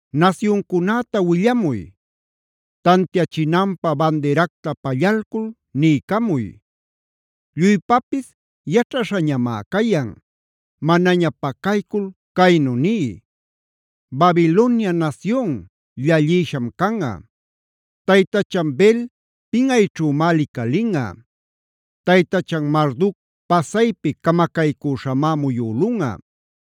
“Nasyuncunäta willamuy. Tantiachinanpä bandiracta pallalcul niycamuy. Lluypapis yaćhaśhañamá cayan; manaña pacaycul caynu niy: ‘Babilonia nasyun, llallïsham canꞌa; taytachan Bel pinꞌayćhümá licalinꞌa. Taytachan Marduc pasaypi camacaycüśhamá muyülunꞌa.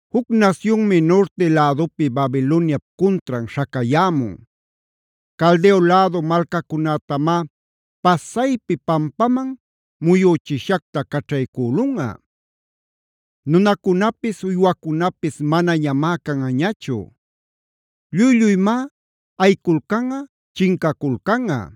Juc nasyunmi nurti lädupi Babiloniap cuntran śhacayämun. Caldeo lädu malcacunätamá pasaypi pampaman muyüchishacta caćhaycülunꞌa. Nunacunapis uywacunapis manañamá canꞌañachu. Lluy-lluyñamá ayiculcanꞌa, chincaculcanꞌa.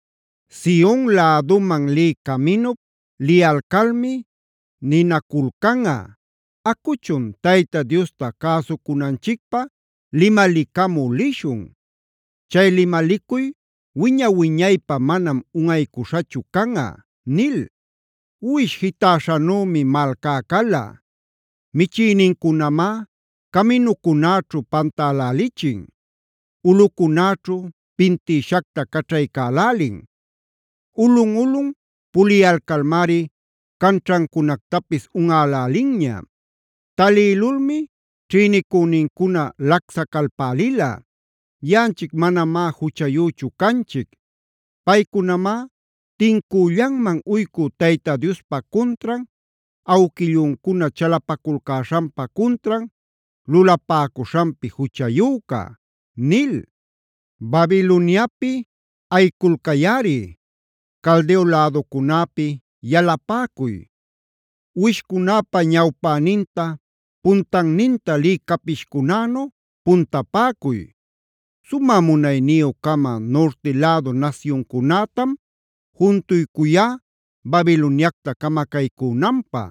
Sion läduman lï caminup liyalcalmi ninaculcanꞌa: ‘Acuchun Tayta Diosta cäsucunanchicpä limalicamü lishun. Chay limalicuy wiña-wiñaypä manam unꞌaycuśhachu canꞌa’ nil. “Uwish jitäśhanümi malcá cala.c Michïnincunamá caminucunäćhu pantälälichin; ulꞌucunäćhu pintïshacta caćhaycälälin. Ulꞌun-ulꞌun puliyalcalmari canćhancunactapis unꞌälälinña. Talïlulmi ćhïnicünincuna lacsacalpälila: ‘Yaꞌanchic manamá juchayüchu canchic. Paycunamá tincüllanman uycü Tayta Diospa cuntran, awquilluncuna chalapaculcäśhanpa cuntran lulapäcuśhanpi juchayüca’ nil. “Babiloniapid ayiculcayꞌari. Caldeo läducunäpi yalapäcuy. Uwishcunäpa ñawpäninta puntanninta lï capishcunänu puntapäcuy. Sumä munayniyü-cama nurti lädu nasyuncunätam juntuycuyá Babiloniacta camacaycünanpä.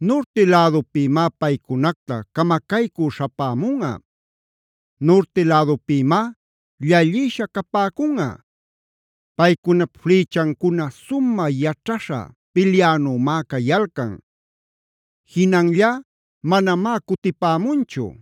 Nurti lädupïmá paycunacta camacaycü śhapämunꞌa; nurti lädupïmá llallïsha capäcunꞌa. Paycunap flïchancuna sumä yaćhaśha pilyänümá cayalcan; jinanllá manamá cutipämunchu.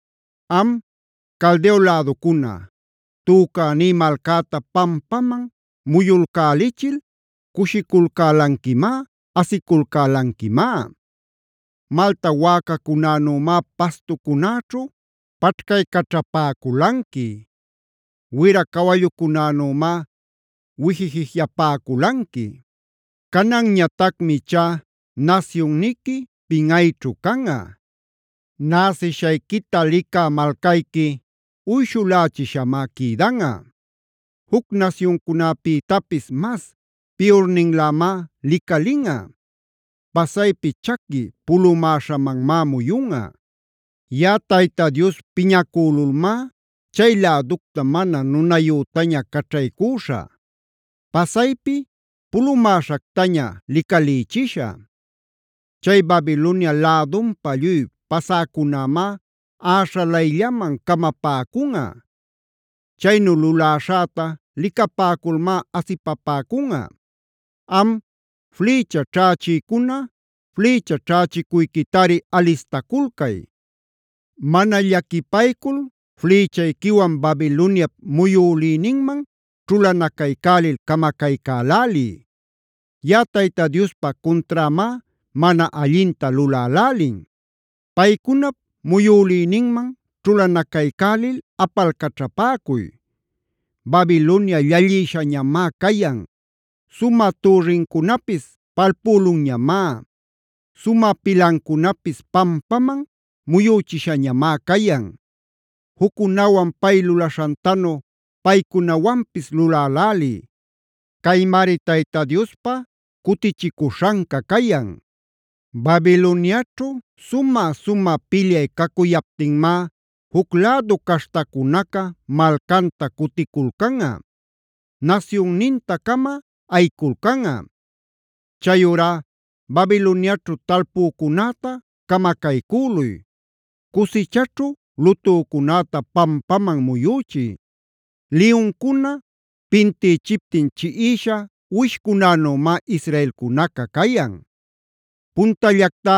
“Am Caldeo läducuna, tücäní malcäta pampaman muyulcälichil cushiculcälanquimá, asiculcälanquimá. Malta wäcacunanümá pastucunäćhu paćhcaycaćhapäculanqui; wira cawallucunänümá wijijij-yapäculanqui. Cananñatacmi ichá nasyunniqui pinꞌayćhu canꞌa; näsishayquita licä malcayqui uyshulächishamá quïdanꞌa. Juc nasyuncunapïtapis mas piyurninlämá licalinꞌa. Pasaypi chaqui pulumäśhamanmá muyunꞌa. Yaꞌa Tayta Dios piñacülulmá chay läducta mana nunayütaña caćhaycüśhä; pasaypi pulumäśhactaña licalïchishä. Chay Babilonia lädunpa lluy pasäcunämá äśhalayllaman camapäcunꞌa; chaynu luläśhäta licapäculmá asipapäcunꞌa. “Am, flïcha ćhächïcuna flïcha ćhächicuyquitari alistaculcay. Mana llaquipaycul flïchayquiwan Babiloniap muyülïninman ćhulanacaycälil camacaycäläliy. Yaꞌa Tayta Diospa cunträmá mana allinta lulälälin. Paycunap muyülïninman ćhulanacaycälil apalcaćhapäcuy. ¡Babilonia llallïshañamá cayan! ¡Sumä türrincunapis palpülunñamá! ¡Sumä pilancunapis pampaman muyüchishañamá cayan! Juccunawan pay lulaśhantanu paycunawanpis luläläliy. Caymari Tayta Diospa cutichicuśhanca cayan. Babiloniaćhu sumä-sumä pilyay cacuyaptinmá juc lädu caśhtacunaca malcanta cuticulcanꞌa; nasyunnintin-cama ayiculcanꞌa.e Chayurá Babiloniaćhu talpücunäta camacaycüluy; cusichaćhu lutücunäta pampaman muyüchiy. “Liyuncuna pintïchiptin chiꞌisha uwishcunanümá israelcunaca cayan. “Puntallactá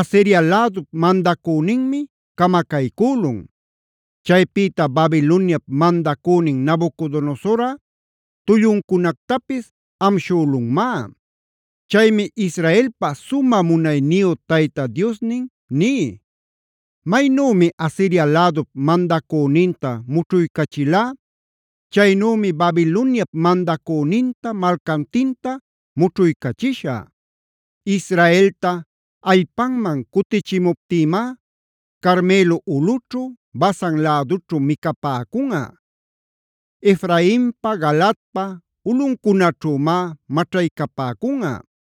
Asiria lädup mandacüninmi camacaycülun. Chaypïta Babiloniap mandacünin Nabucodonosorꞌa tulluncunactapis amshülunmá. Chaymi Israelpa sumä munayniyu Tayta Diosnin ní: Maynümi Asiria lädup mandacüninta mućhuycachilá, chaynümi Babiloniap mandacüninta, malcantinta mućhuycachishä. Israelta allpanman cutichimuptïmá Carmelo ulꞌućhu, Basan lädućhu micapäcunꞌa. Efrainpa, Galaadpa ulꞌuncunaćhümá maćhaycapäcunꞌa.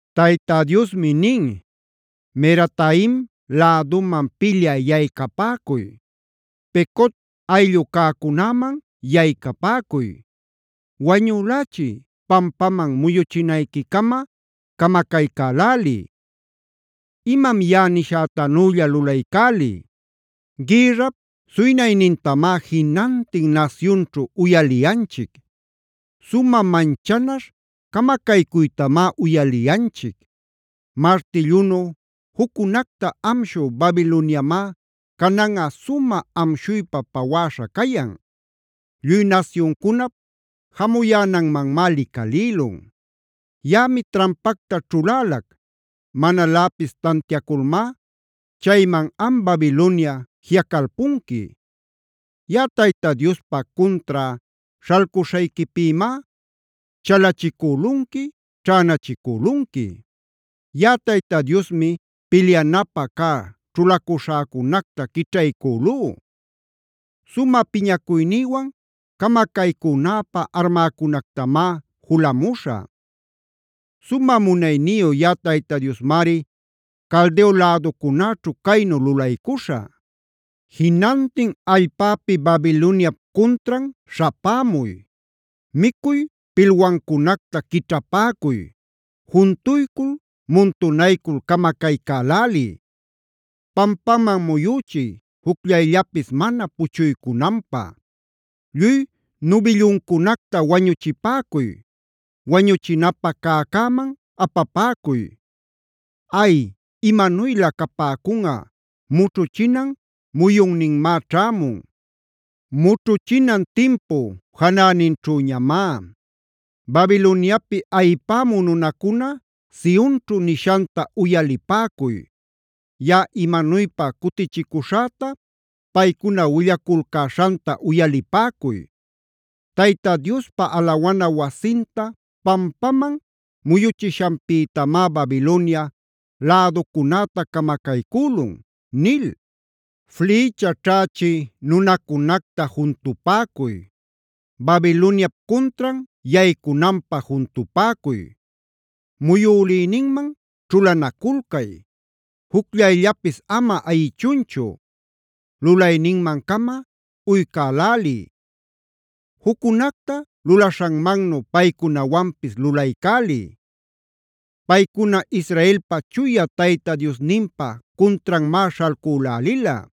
Tayta Diosmi nin: “Merataim läduman pilyä yaycapäcuy; Pecod ayllu cäcunäman yaycapäcuy. Wañülächiy; pampaman muyuchinayquicama camacaycäläliy. Imam yaꞌa nishätanülla lulaycäliy. Gïrrap suynaynintamá jinantin nasyunćhu uyaliyanchic; sumä manchanaśh camacaycuytamá uyaliyanchic. Martillunuf juccunacta amshü Babiloniamá cananꞌa sumä amshuypa pawäśha cayan. Lluy nasyuncunap jamuyänanmanmá licalïlun. Yaꞌami trampacta ćhulälac; manaläpis tantiaculmá chayman am Babilonia jiꞌacalpunqui. Yaꞌa Tayta Diospa cuntrá śhalcuśhayquipïmá chalachicülunqui, ćhänachicülunqui. Yaꞌa Tayta Diosmi pilyanapä cä ćhulacuśhäcunacta quićhaycülú; sumä piñacuynïwan camacaycünäpä armäcunactamá julamuśhä. Sumä munayniyu yaꞌa Tayta Diosmari Caldeo läducunäćhu caynu lulaycuśhä. Jinantin allpäpi Babiloniap cuntran śhapämuy. Micuy pilwancunacta quićhapäcuy. Juntuycul, muntunaycul camacaycäläliy. Pampaman muyüchiy, jucllayllapis mana puchuycunanpä. Lluy nubillucunacta wañuchipäcuy. Wañuchinapä cäcäman apapäcuy. Ay, imanuylä capäcunꞌa, mućhuchinan muyunninmá ćhämun; mućhuchinan timpu janäninćhüñamá. “Babiloniapi ayïpämü nunacuna, Sionćhu nishanta uyalipäcuy; yaꞌa imanuypa cutichicuśhäta, paycuna willaculcäśhanta uyalipäcuy: ‘Tayta Diospa alawana wasinta pampaman muyuchishanpïtamá Babilonia läducunäta camacaycülun’ nil. “Flïcha ćhächï nunacunacta juntupäcuy. Babiloniap cuntran yaycunanpä juntupäcuy. Muyülïninman ćhulanaculcay. Jucllayllapis ama ayichunchu. Lulayninman-cama uycäläliy;g juccunacta lulaśhanmannu paycunawanpis lulaycäliy. Paycuna Israelpa Chuya Tayta Diosninpa cuntranmá śhalcülälila.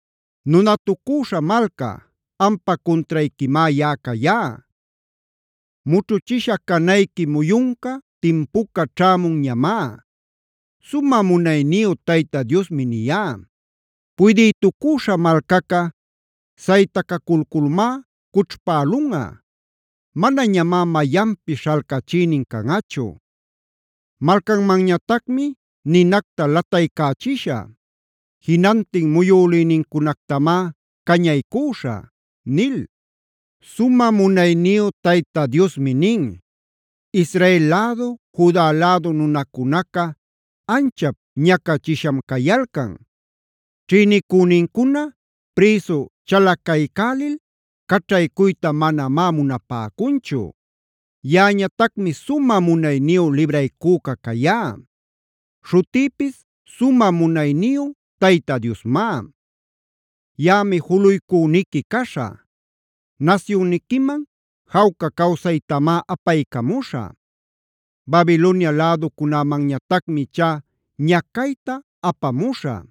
“Nunatucüśha malca, ampa cuntrayquimá yaꞌa cayá. Mućhuchisha canayqui muyunca, timpuca ćhämunñamá. Sumä munayniyu Tayta Diosmi niyá. Puydïtucüśha malcaca saytacaculculmá cućhpälunꞌa. Manañamá mayanpis śhalcachïnin canꞌachu. Malcanmanñatacmi ninacta lataycächishä; jinantin muyulïnincunactamá cañaycüśhä” nil. Sumä munayniyu Tayta Diosmi nin: “Israel lädu, Juda lädu nunacunaca anchap ñacachisham cayalcan. Ćhïnicünincuna prïsu chalacaycälil caćhaycuyta manamá munapäcunchu. Yaꞌañatacmi sumä munayniyu libraycüca cayá. Śhutïpis sumä munayniyu Tayta Diosmá. Yaꞌami juluycüniqui caśhä; nasyunniquiman jawca cawsaytamá apaycamuśhä. Babilonia läducunämanñatacmi ichá ñacayta apamuśhä.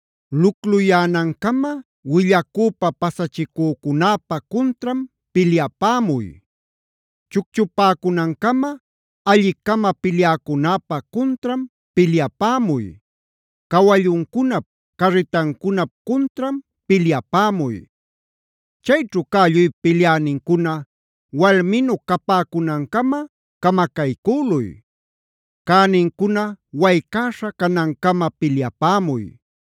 Lucluyänancama willacüpa pasachicücunäpa cuntran pilyapämuy. Chucchupäcunancama alli-cama pilyäcunäpa cuntran pilyapämuy. Cawalluncunap, carritancunap cuntran pilyapämuy. Chayćhu cä lluy pilyänincuna walminu capäcunancama camacaycüluy. Cänincuna waycäśha canancama pilyapämuy.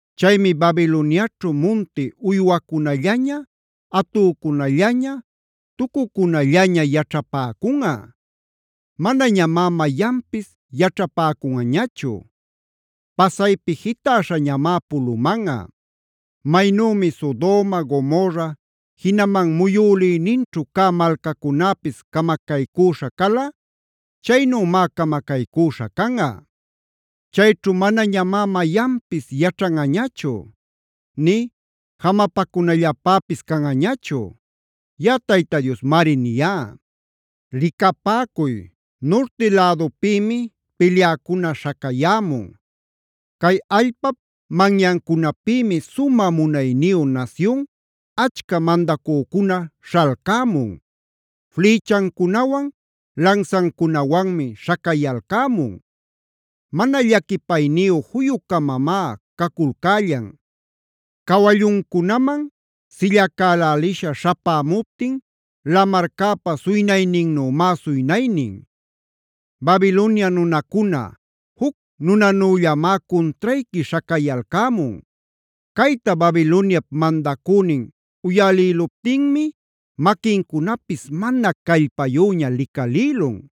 “Chaymi Babiloniaćhu munti uywacunallaña, atücunallaña,h tucucunallaña yaćhapäcunꞌa. Manañamá mayanpis yaćhapäcunꞌañachu; pasaypi jitäśhañamá pulumanꞌa. Maynümi Sodoma, Gomorra, jinaman muyülïninćhu cä malcacunäpis camacaycüśha cala, i chaynümá camacaycüśha canꞌa. Chayćhu manañamá mayanpis yaćhanꞌañachu; nï jamapacunallapäpis canꞌañachu.j Yaꞌa Tayta Diosmari niyá. “Licapäcuy, nurti lädupïmi pilyäcuna śhacayämun. Cay allpap manyancunapïmi sumä munayniyu nasyun, achca mandacücuna śhalcämun. Flïchancunawan, lansancunawanmi śhacayalcämun. Mana llaquipayniyu juyu-camamá caculcällan. Cawalluncunaman sillacälälisha śhapämuptin lamarcäpa suynayninnümá suynaynin. Babilonia nunacuna, juc nunanüllamá cuntrayqui śhacayalcämun. Cayta Babiloniap mandacünin uyalïluptinmi maquincunapis mana callpayüña licalïlun.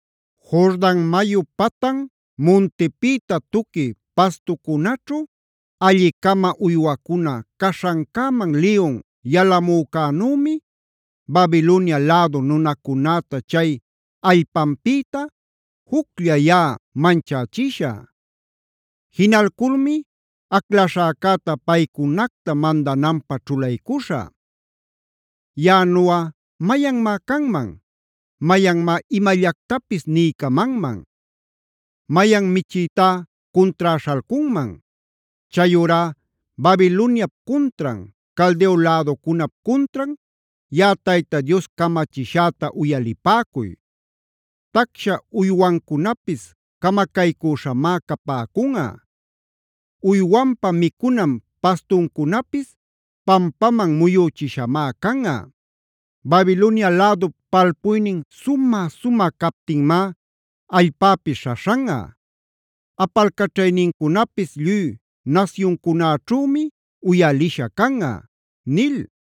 “Jordan mayu patan muntipïta tuqui pastucunaćhu, alli-cama uywacuna caśhancäman liyun yalamücänümi Babilonia lädu nunacunäta chay allpanpïta, juclla yaꞌa manchächishä. Jinalculmi aclaśhäcäta paycunacta mandananpä ćhulaycuśhä. Yaꞌanuꞌa ¿mayanmá canman? ¿Mayanmá imallactapis niycamanman? ¿Mayan michïtá cuntrá śhalcunman? “Chayurá Babiloniap cuntran, Caldeo läducunap cuntran yaꞌa Tayta Dios camachishäta uyalipäcuy. Tacsha uywancunapis camacaycüśhamá capäcunꞌa; uywanpa micunan pastuncunapis pampaman muyüchishamá canꞌa. Babilonia lädup palpuynin sumä-sumä captinmá allpäpis śhaśhanꞌa. Apalcaćhaynincunapis lluy nasyuncunäćhümi uyalisha canꞌa” nil.